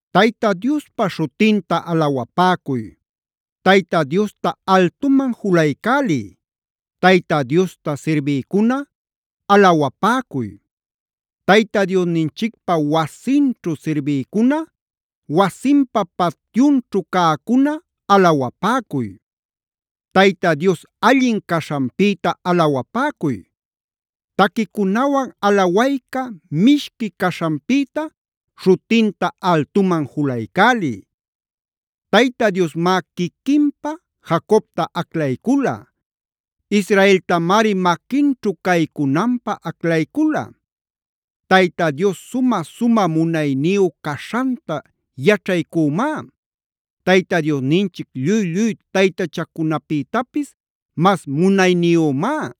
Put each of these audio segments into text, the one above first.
Tayta Diospa śhutinta alawapäcuy. Tayta Diosta altuman julaycäliy. Tayta Diosta sirbïcuna, alawapäcuy. Tayta Diosninchicpawasinćhu sirbïcuna, wasinpa patyunćhu cäcuna alawapäcuy. Tayta Dios allin caśhanpïta alawapäcuy. Taquicunawan alawayca mishqui caśhanpïta śhutinta altuman julaycäliy. Tayta Diosmá quiquinpä Jacobta aclaycula. Israeltamari maquinćhu caycunanpä aclaycula. Tayta Dios sumä-sumä munayniyu caśhanta yaćhaycümá. Tayta Diosninchic lluy-lluy taytachacunapïtapis mas munayniyümá.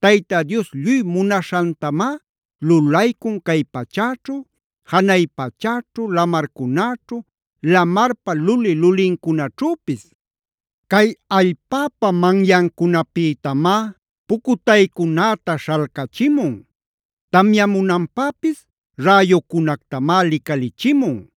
Tayta Dios lluy munaśhantamá lulaycun cay pachäćhu, janay pachäćhu, lamarcunäćhu, lamarpa luli-lulinnincunaćhüpis. Cay allpäpa manyancunapïtamá pucutaycunäta śhalcachimun. Tamyamunanpäpis räyucunactamá licalichimun.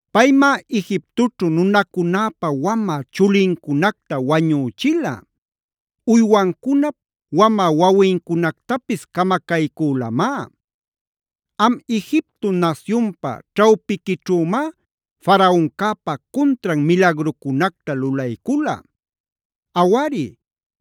Paymá Egiptoćhu nunacunäpa wamä chulincunacta wañüchila. Uywancunap wamä wawincunactapis camacaycülamá. Am Egipto nasyunpa ćhawpiquićhümá Faraoncäpa cuntran milagrucunacta lulaycula. Awari,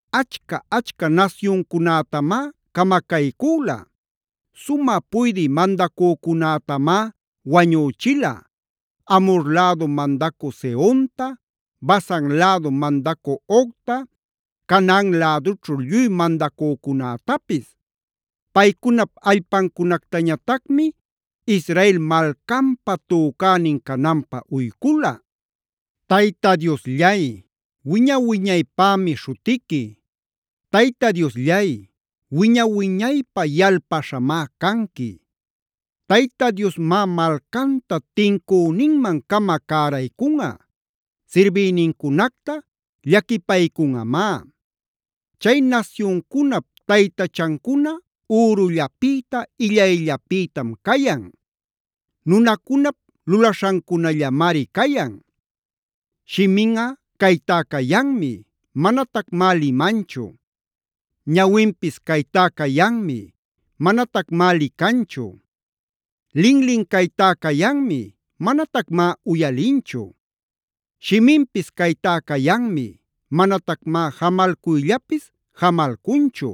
Achca-achca nasyuncunätamá camacaycüla. Sumä puydï mandacücunätamá wañüchila: Amhor lädu mandacü Sehonta, Basan lädu mandacü Ogta,c Canaan lädućhu lluy mandacücunätapis. Paycunap allpancunactañatacmi Israel malcanpa tücänin cananpä uycula. ¡Tayta Diosllay, wiña-wiñaypämi śhutiqui! ¡Tayta Diosllay, wiña-wiñaypä yalpaśhamá canqui! Tayta Diosmá malcanta tincüninman-cama cäraycunꞌa.d Sirbïnincunacta llaquipaycunꞌamá. Chay nasyuncunap taytachancuna ürullapïta, illayllapïtam cayan. Nunacunap lulaśhancunallamari cayan. Shiminꞌa caytá cayanmi, manatacmá limanchu. Ñawinpis caytá cayanmi, manatacmá licanchu. Linlin caytá cayanmi, manatacmá uyalinchu. Shiminpis caytá cayanmi, manatacmá jamalcuyllapis jamalcunchu.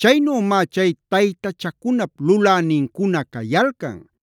Chaynümá chay taytachacunap lulänincuna cayalcan.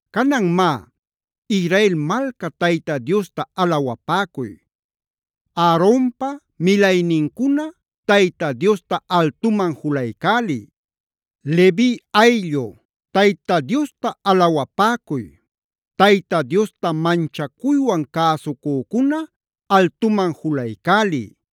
Canan má, Israel malca Tayta Diosta alawapäcuy. Aaronpa milaynincuna, Tayta Diosta altuman julaycäliy. Levi ayllu, Tayta Diosta alawapäcuy. Tayta Diosta manchacuywan cäsucücuna, altuman julaycäliy.